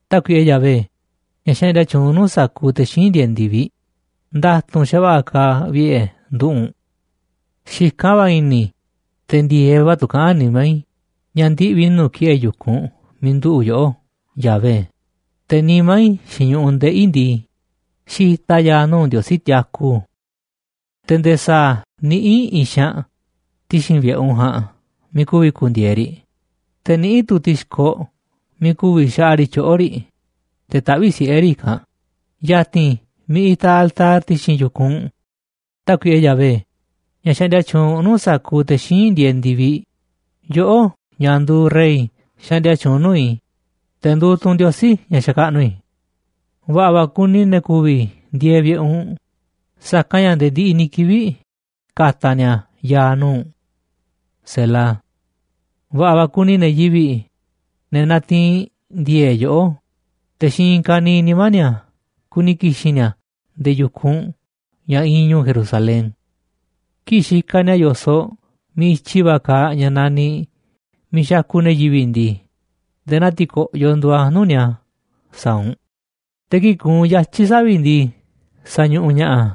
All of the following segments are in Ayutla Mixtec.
Tákuiꞌe Yahvé, ña̱ xaꞌndia tyuunꞌ nuu̱ꞌ sa̱kuuꞌ te̱ xíinꞌ ndieeꞌ ndi̱viꞌ, nda̱tu̱nꞌ xa̱va̱ꞌa̱ kaaꞌ vi̱ꞌe̱ nduꞌu̱ꞌ u̱nꞌ. Xikán va̱ i̱ni̱ i̱, te̱ ndi̱e̱eꞌ va̱ tu̱ kaꞌán nimá i̱ ña̱ ndiꞌvi̱ i̱ nuu̱ꞌ ki̱ꞌe̱ yu̱kunꞌ miiꞌ nduꞌu̱ꞌ yoꞌó, Yahvé, te̱ nimá i̱ xiinꞌ ñu̱ꞌuꞌ ndeꞌi̱ i̱ ndii, xitaꞌ a̱ ya̱a̱ nuu̱ꞌ Ndiosí tiaku. Te̱ nde̱e̱ sa̱a̱ niꞌíꞌ i̱i̱n xaanꞌ ti̱xi̱n vi̱ꞌe̱ u̱nꞌ ja̱a̱nꞌ miiꞌ ku̱vi̱ ku̱ndi̱e̱e̱ riꞌ, te̱ niꞌíꞌ tu̱ ti̱xkoꞌ miiꞌ ku̱vi̱ xaꞌa riꞌ tyoꞌo̱ riꞌ, te̱ taꞌvíꞌ siꞌe̱ riꞌ i̱kanꞌ, ya̱ti̱n miiꞌ itaꞌ altar ti̱xi̱n yu̱kunꞌ u̱nꞌ, Tákuiꞌe Yahvé, ña̱ xaꞌndia tyuunꞌ nuu̱ꞌ sa̱kuuꞌ te̱ xíinꞌ ndieeꞌ ndi̱viꞌ, yoꞌó, ña̱ nduuꞌ Rey xaꞌndia tyuunꞌ nuu̱ꞌ i̱, te̱ nduuꞌ tu̱ u̱nꞌ Ndiosí ña̱ xakaꞌnuꞌ i̱. Va̱ꞌa̱ va̱ kuni ne̱ ku̱vi̱ ndieeꞌ vi̱ꞌe̱ u̱nꞌ, sa̱kanꞌ ña̱ nde̱e̱ ndiꞌiꞌ ni̱ kivi̱ꞌ ka̱ta̱ ni̱a̱ ya̱a̱ nuu̱ꞌ u̱nꞌ. Va̱ꞌa̱ va̱ kuni ne̱ yivi̱ꞌ, ne̱ natiinꞌ ndi̱e̱e̱ꞌ yoꞌó, te̱ xiinꞌ i̱i̱n ka̱niiꞌ nimá ni̱a̱ kuni ki̱xi̱n ni̱a̱ nde̱e̱ yu̱kunꞌ u̱nꞌ ña̱ iinꞌ ñu̱u̱ Jerusalén. Kii̱ꞌ xikaꞌ ni̱a̱ yo̱soꞌ miiꞌ i̱tyi va̱ kaaꞌ ña̱ naniꞌ miiꞌ xakuꞌ ne̱ yivi̱ꞌ ndii, nde̱e̱ naa ti̱ko̱ꞌyoꞌ nduuꞌ a̱ nuu̱ꞌ ni̱a̱ sa̱a̱ u̱nꞌ, te̱ kii̱ꞌ kuunꞌ yatyi̱ savi̱ꞌ ndii, sañuꞌuꞌ ña̱ꞌaꞌ a̱.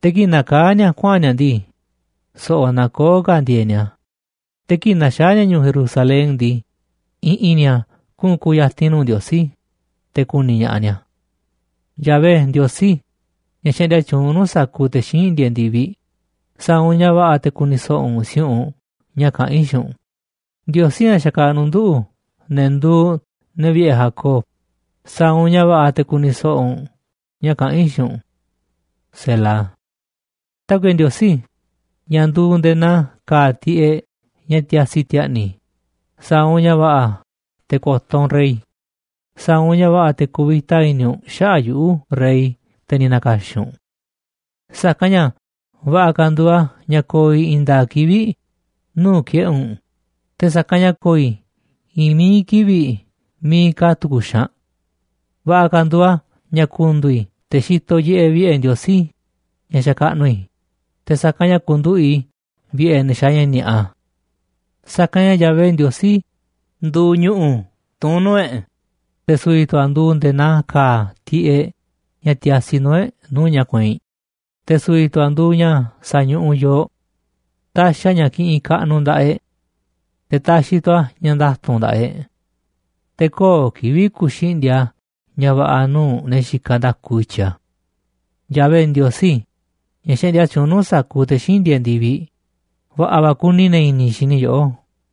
Te̱ kii̱ꞌ nakaá ni̱a̱ kuaꞌa̱n ni̱a̱ ndii, so̱ꞌo̱ nakoó ka̱ ndi̱e̱e̱ꞌ ni̱a̱, te̱ kii̱ꞌ na̱xaa̱ ni̱a̱ ñu̱u̱ Jerusalén ndii, i̱ꞌi̱n ni̱a̱ kuꞌu̱n ku̱ya̱ti̱n nuu̱ꞌ Ndiosí, te̱ ku̱ni̱ ña̱ꞌaꞌ ni̱a̱. Yahvé Ndiosí, ña̱ xaꞌndia tyuunꞌ nuu̱ꞌ sa̱kuuꞌ te̱ xíinꞌ ndieeꞌ ndi̱viꞌ, sa̱a̱ u̱nꞌ ña̱ va̱ꞌa̱ te̱ ku̱ni̱ so̱ꞌo̱ u̱nꞌ si̱u̱ꞌunꞌ ña̱ kaꞌán i̱ xiinꞌ u̱nꞌ, Ndiosí, ña̱ xakaꞌnuꞌ nduꞌu̱, ne̱ nduuꞌ ne̱ vi̱ꞌe̱ Jacob, sa̱a̱ u̱nꞌ ña̱ va̱ꞌa̱ te̱ ku̱ni̱ so̱ꞌo̱ u̱nꞌ ña̱ kaꞌán i̱ xiinꞌ u̱nꞌ. Tákuiꞌe Ndiosí, ña̱ nduuꞌ nde̱e̱ naa ka̱a̱ tiꞌeꞌ ña̱ tiasi ti̱a̱ꞌni̱ i̱, sa̱a̱ u̱nꞌ ña̱ va̱ꞌa̱ te̱ ko̱to̱ u̱nꞌ rey, sa̱a̱ u̱nꞌ ña̱ va̱ꞌa̱ te̱ ku̱vi̱ta i̱ni̱ u̱nꞌ xaꞌa̱ꞌ yuꞌu̱, rey, te̱ ni̱ na̱ka̱xi̱n u̱nꞌ. Sa̱kanꞌ ña̱ va̱ꞌa̱ ka̱ nduuꞌ a̱ ña̱ ko̱o̱ i̱ i̱i̱n nda̱a̱ꞌ kivi̱ꞌ nuu̱ꞌ ki̱ꞌe̱ u̱nꞌ, te̱ sa̱kanꞌ ña̱ ko̱o̱ i̱ i̱i̱n mií kivi̱ꞌ miiꞌ ka̱ tu̱ku̱ xaanꞌ. Va̱ꞌa̱ ka̱ nduuꞌ a̱ ña̱ ku̱ndu̱u̱ i̱ te̱ xitoꞌ yiꞌeꞌ vi̱ꞌe̱ Ndiosí ña̱ xakaꞌnuꞌ i̱, te̱ sa̱kanꞌ ña̱ ku̱nduꞌu̱ꞌ i̱ vi̱ꞌe̱ ne̱ xaaꞌ ña̱ ni̱a̱ꞌa. Sa̱kanꞌ ña̱ Yahvé Ndiosí nduuꞌ ñu̱ꞌu̱ tuún nuu̱ꞌ e̱ꞌ, te̱ su̱vi̱ tu̱ a̱ nduuꞌ nde̱e̱ naa ka̱a̱ tiꞌeꞌ ña̱ tiasi nuu̱ꞌ e̱ꞌ nuu̱ꞌ ña̱ kueinꞌ, te̱ su̱vi̱ tu̱ a̱ nduuꞌ ña̱ sañuꞌuꞌ yooꞌ. Taxiꞌ a̱ ña̱ kiꞌinꞌ kaꞌnuꞌ nda̱ꞌaꞌ e̱ꞌ, te̱ taxiꞌ tu̱ a̱ ña̱ nda̱tu̱nꞌ nda̱ꞌaꞌ e̱ꞌ. Te̱ köo̱ꞌ kivi̱ꞌ ku̱xindi̱a̱ꞌ a̱ ña̱ va̱ꞌa̱ nuu̱ꞌ ne̱ xikaꞌ nda̱ku i̱tyiꞌ a̱. Yahvé Ndiosí, ña̱ xaꞌndia tyuunꞌ nuu̱ꞌ sa̱kuuꞌ te̱ xíinꞌ ndieeꞌ ndi̱viꞌ, va̱ꞌa̱ va̱ kuni ne̱ i̱ni̱ xi̱ni̱ yoꞌó.